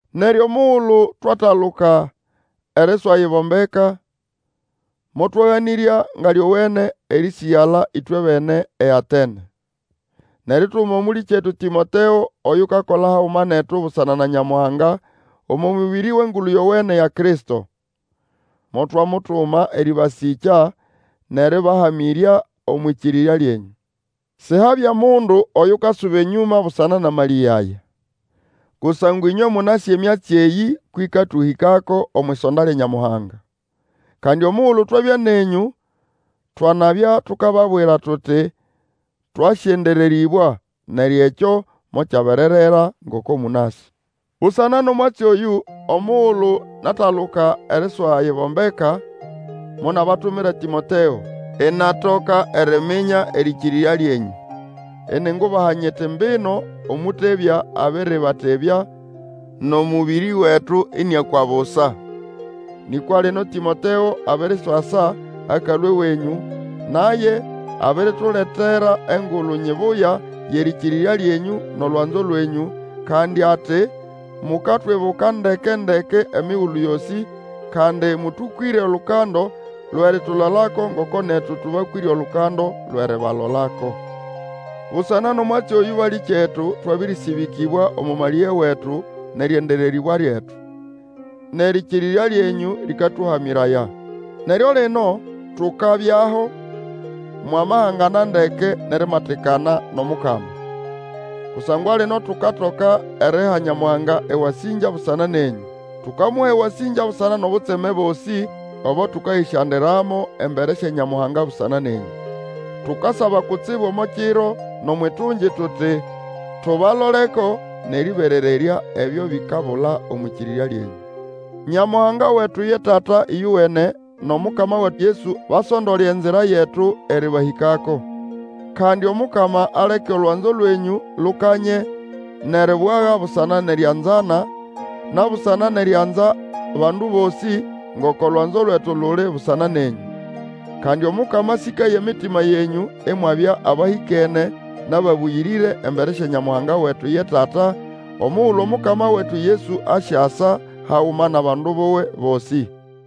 Neryo omugulu twataluka eriswayibombeka, motwaganĩrya nga lyowene erĩsĩgala ĩtwebene eAtene; nʼerituma mũlĩkyetu Tĩmoteo, oyukakola haguma netu busana na Nyamuhanga omo mũbĩrĩ wʼEngulu Yowene ya Kristo. Motwamutuma erĩbasĩkya nʼerĩbahamĩrya omwʼĩkĩrĩrya lyenyũ, sihabya mundu Oyukasuba enyũma busana nʼamalĩge aya. Kusangwa ĩnywe mũnasĩ emyatsi eyĩ kwʼĩkatũhĩkako omwʼisonda lya Nyamuhanga. Kandi omugulu twabya nenyũ twanabya tukababwira tuti twasyendererĩbwa; neryo ekyo mokyabererera, ngoko mũnasĩ. Busana nʼomwatsi oyũ, omugulu nataluka eriswayibombeka, monabatumira Tĩmoteo, inatoka eriminya erĩkĩrĩrya lyenyũ, iningubaha nyiti mbino omũtebya abĩrĩbatebya, nʼomũbĩrĩ wetu ĩnĩakwa busa. Nĩkwa lino Tĩmoteo abiriswasa akalũa ewenyũ, naye abirituletera engulu nyibuya yʼerĩkĩrĩrya lyenyũ nʼolwanzo lwenyũ, kandi ati mukatwibuka ndekendeke emigulu yosĩ, kandi mũtũkwĩre olukando lwʼeritulolako ngoko netu tũbakwĩre olukando lwʼeribalolako. Busana nʼomwatsi oyũ, balĩkyetu, twabĩrĩsĩbĩkĩbwa omo malĩge wetu nʼerĩendererĩbwa lyetu. Nʼerĩkĩrĩrya lyenyũ lĩkatũhamĩraya. Neryo lino tukabyaho, mwamahangana ndeke nʼerimatikana nʼOmukama. Kusangwa lino tukatoka eriha Nyamuhanga ewasĩngya busana nenyũ. Tukamuha ewasĩngya busana nʼobutseme bosĩ obo tũkayĩsyandiramo embere sya Nyamuhanga busana nenyũ. Tukasaba kutsibu omo kiro nʼomwʼitungi tuti tubaloleko nʼerĩberererya ebyo bikabula omwʼĩkĩrĩrya lyenyũ. Nyamuhanga wetu ye Tata ĩyowene, nʼOmukama wetu Yesu basondole enzira yetu erĩbahĩkako. Kandi Omukama aleke olwanzo lwenyũ lukanye nʼeribwaga busana nʼerianzana, na busana nʼerianza bandu bosĩ, ngoko lwanzo lwetu luli busana nenyũ. Kandi Omukama asĩkaye emitima yenyũ imwabya abahĩkene nʼababũyĩrĩre embere sya Nyamuhanga wetu ye Tata, omugulu Omukama wetu Yesu asyasa haguma nʼabandu buwe bosĩ.